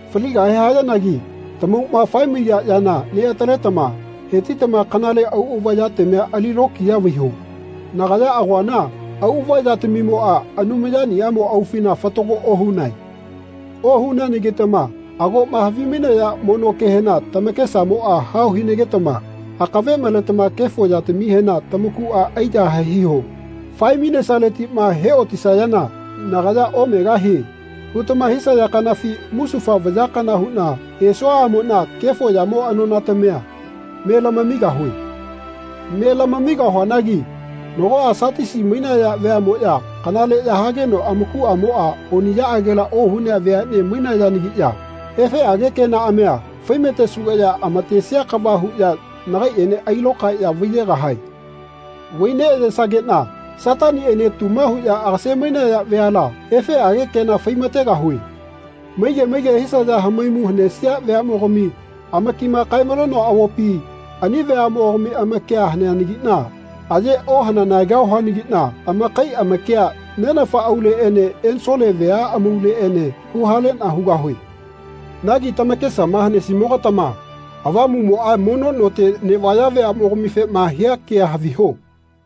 Faligahe hayanagi tamauꞌma fae-maiya yana neꞌataletama hetitama kanale auꞌava yatamia ali lokiya vaiho. Nagaya agoana auꞌava yatamimoꞌa Anumayaniꞌamo aufina fatago ohunae. Ohuneanagitama agoꞌma havi-mainaya mono kehena tamakesamoꞌa hao hinagetama akave maletama kefo yatamihena tamakuꞌa aiyahae hiho. Fae-mainesaletiꞌma he otisayana nagaya ‘Omegahie.’ hutama hisaya kanafi musufa vaya kana huꞌna esuaꞌamoꞌna kefo yamo anonatamia me lamamigahue. Me lamamigahuanagi nagoꞌa Satisi mainaya veaꞌmoꞌya kanaleꞌya hageno amakuꞌamoꞌa oniꞌyaꞌagela ohunea veaꞌne mainayanagiꞌya efeꞌage kenaꞌamia faimatesugeꞌya amatesia kava huꞌya nagaiꞌene ailokaeꞌya vaiyegahae. Vai neꞌayesageꞌna Sataniꞌene tuma huꞌya agase-mainaya veala efeꞌage kena faimategahue. Maige maige hisaya hamaimu hanesia veaꞌmogami amakima kae-malenoa avopi ani veaꞌmogami amakia haneanagiꞌna aye ohananegahuanagiꞌna amakai amakia Nenafa auleꞌene ensole vea amauleꞌene huhaleꞌna hugahue.” Nagi tamakesama hanesimoga-tama Avamuꞌmoꞌa mono note neꞌvaya veaꞌmogamifema hia kea haviho.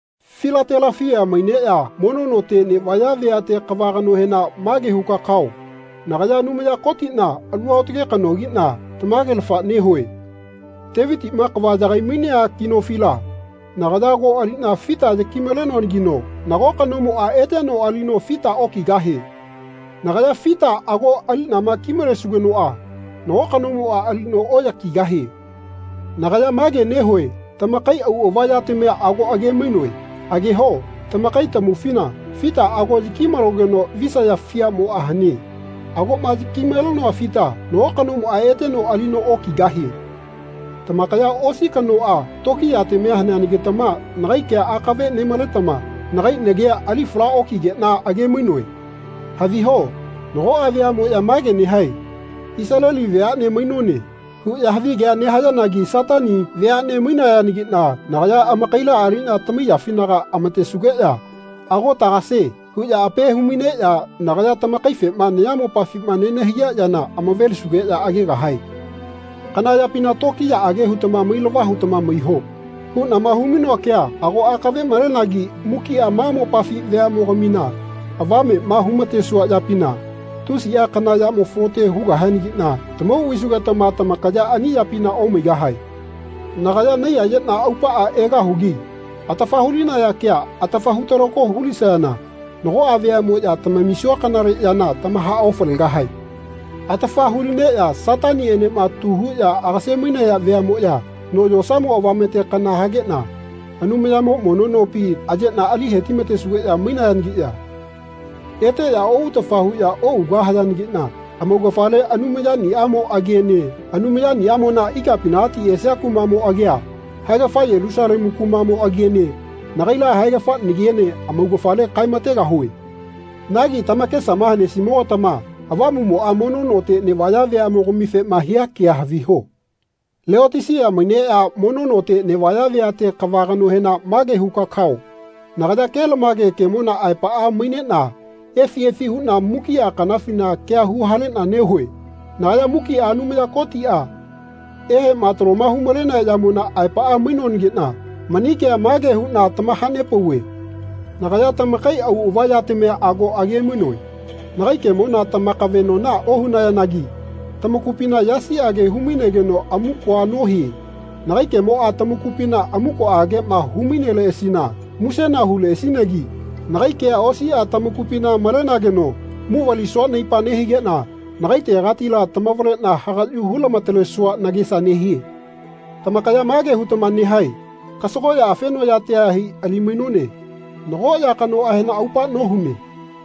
Filatelafia maineꞌya mono note neꞌvaya veate kava kanohena mage huka kao nagaya Anumaya Kotiꞌna alu aotage kanogiꞌna tamagelafa nehue. Tevitiꞌma kava yagai-mainea ki nofila nagaya ago aliꞌna fita yaki-malenoanagino nago kanomoꞌa eteno alino fita okigahie. Nagaya fita ago aliꞌnama ki-malesugenoꞌa nago kanomoꞌa alino oꞌyakigahie. Nagaya mage nehue tamakai auꞌava yatamia ago age-mainoe. Ageho tamakai tamaufina fita ago yaki-malogeno visaya fiamoꞌa hane. Agoꞌma yaki-malenoa fita nago kanomoꞌa eteno alino okigahie. Tamakaya osi kanoꞌa tokiyatamia hanegetama nagai kea akave nemaletama nagai nagia ali fala okigeꞌna age-mainoe. Haviho nagoꞌa veaꞌmoꞌya mage nehae “Isaleli veaꞌne mainone.” huꞌya havigea nehayanagi Satani veaꞌne mainayanagiꞌna nagaya amakaila aliꞌna tamaiyafinaga amatesugeꞌya “Ago tagase.” huꞌya ape humaineꞌya nagaya tamakaifema nayamopafima nenahaiya yana amavelisugeꞌya agegahae. “Kana yapina tokiyaꞌage hutama mailava hutama maiho.” huꞌnama hu-mainoa kea ago akave malenagi mukiꞌa ma mopafi veaꞌmogamina avameꞌma humatesua yapina tusiꞌa kana yamo falote hugahianagiꞌna tamau vaisugetama tamakaya ani yapina omaigahae. Nagaya naiyayeꞌna aupaꞌa egahugi. Atafa hulinaya kea atafa hutalako hulisayana nagoꞌa veaꞌmoꞌya tamamisua kanale yana tamahaofalegahae. Atafa hulineꞌya Sataniꞌenema tuma huꞌya agase-mainaya veaꞌmoꞌya no yosamo avamete kana hageꞌna Anumayamo mono nopi ayeꞌna ali hetimatesugeꞌya maigahayanagiꞌya eteꞌya oꞌutafa huꞌya oꞌugahayanagiꞌna amaugafale Anumayaniꞌamo agiene Anumayaniꞌamona ikapinagati esia kumaꞌmo agia, haegafa Yelusalemu kumaꞌmo agiene nagaila haegafa nagiene amaugafale kaemategahue. Nagi tamakesama hanesimogatama Avamuꞌmoꞌa mono note neꞌvaya veaꞌmogamifema hia kea haviho. Leotisia maineꞌya mono note neꞌvaya veate kava kanohena mage huka kao nagaya kelamage kemona aepaꞌa maineꞌna efi efi huꞌna mukiꞌa kanafina kea huhaleꞌna nehue. Nagaya mukiꞌa Anumaya Kotiꞌa eheꞌma taloma humalenea yamona aepaꞌa mainoanagiꞌna mani kea mage huꞌna tamahanepauve. Nagaya tamakai auꞌava yatamia ago age-mainoe. Nagai kemona tamakaveꞌnona ohunayanagi tamakupina yasiꞌage humainegeno amukoa nohie. Nagai kemoꞌa tamakupina amukoꞌageꞌma hu-maineleꞌasina musena huleꞌasinagi nagai kea osiꞌa tamakupina malenageno muvalisua naipa nehigeꞌna nagaitegatila tamavaleꞌna hagaꞌyu hu-lamatalesua nagesa nehie. Tamakaya mage hutama nehae “Kasagoꞌya afenoꞌyatia hai ali-mainone. Nago ya kanoꞌahena aupa nohune.”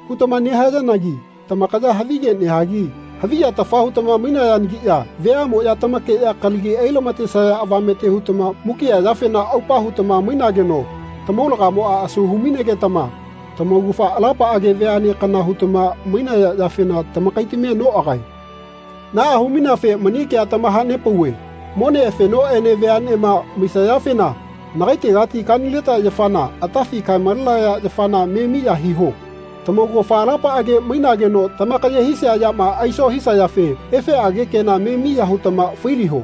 hutama nehayanagi tamakaya havige nehagi haviyatafa hutama mainayanagiꞌya veaꞌmoꞌya tamakeꞌya kalagi ai-lama-tesaya avamete hutama mukiꞌa yafena aupa hutama mainageno tamaulagamoꞌa asu hu-mainegetama tamaugafa alapaꞌage veaꞌne kana hutama mainaya yafena tamakaitamia noꞌagae. Naꞌa humaineafe mani kea tamahanepauve mone afenoꞌene veaꞌnema maisayafena nagaitegati kanileta yafana, atafi kae-malenaya yafana me miya hiho. Tamaugafa alapaꞌage mainageno tamakaye hisia yama aiso hisayafe efeꞌage kena me miya hutama failiho.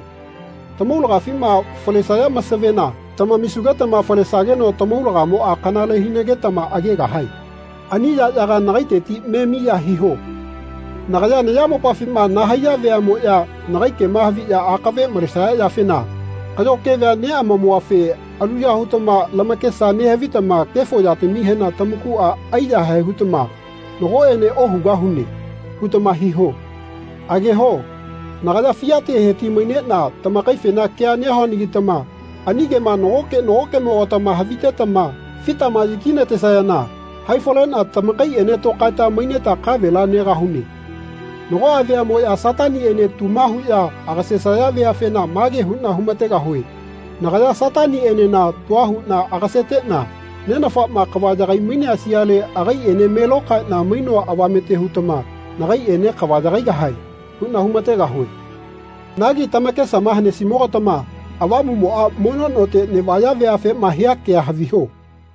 Tamaulagafima falesaya masavena tamamisugetama falesageno tamaulagamoꞌa kanale hinagetama agegahae. Ani yaꞌyaga nagaiteti me miya hiho. Nagaya nayamopafima nahaiya veaꞌmoꞌya nagai kema haviꞌya akave malesaya yafena kaꞌyo kevea neꞌamamuafe aluya hutama lamakesa nehavitama kefo yatamihena tamakuꞌa aiyahae hutama “Nagoꞌene ohugahune.” hutama hiho. Ageho nagaya fiate heti-maineꞌna tamakaifena kea nehuanagitama ani kema nagoke nagokeꞌmogatama havitetama fitama yaki-natesayana haifaleꞌna tamakaiꞌene tokaeta maineta kavela negahune. Nagoꞌa veaꞌmoꞌya Sataniꞌene tuma huꞌya agasesaya veafena mage huꞌna humategahue “Nagaya Sataniꞌenena tua huꞌna agaseteꞌna Nenafaꞌma kava yagai-mainea sialela agaiꞌene me lokaeꞌna mainoa avamete hutama nagaiꞌene kava yagaigahae.” huꞌna humategahue. Nagi tamakesama hanesimoga-tama Avamuꞌmoꞌa mono note neꞌvaya veafema hia kea haviho.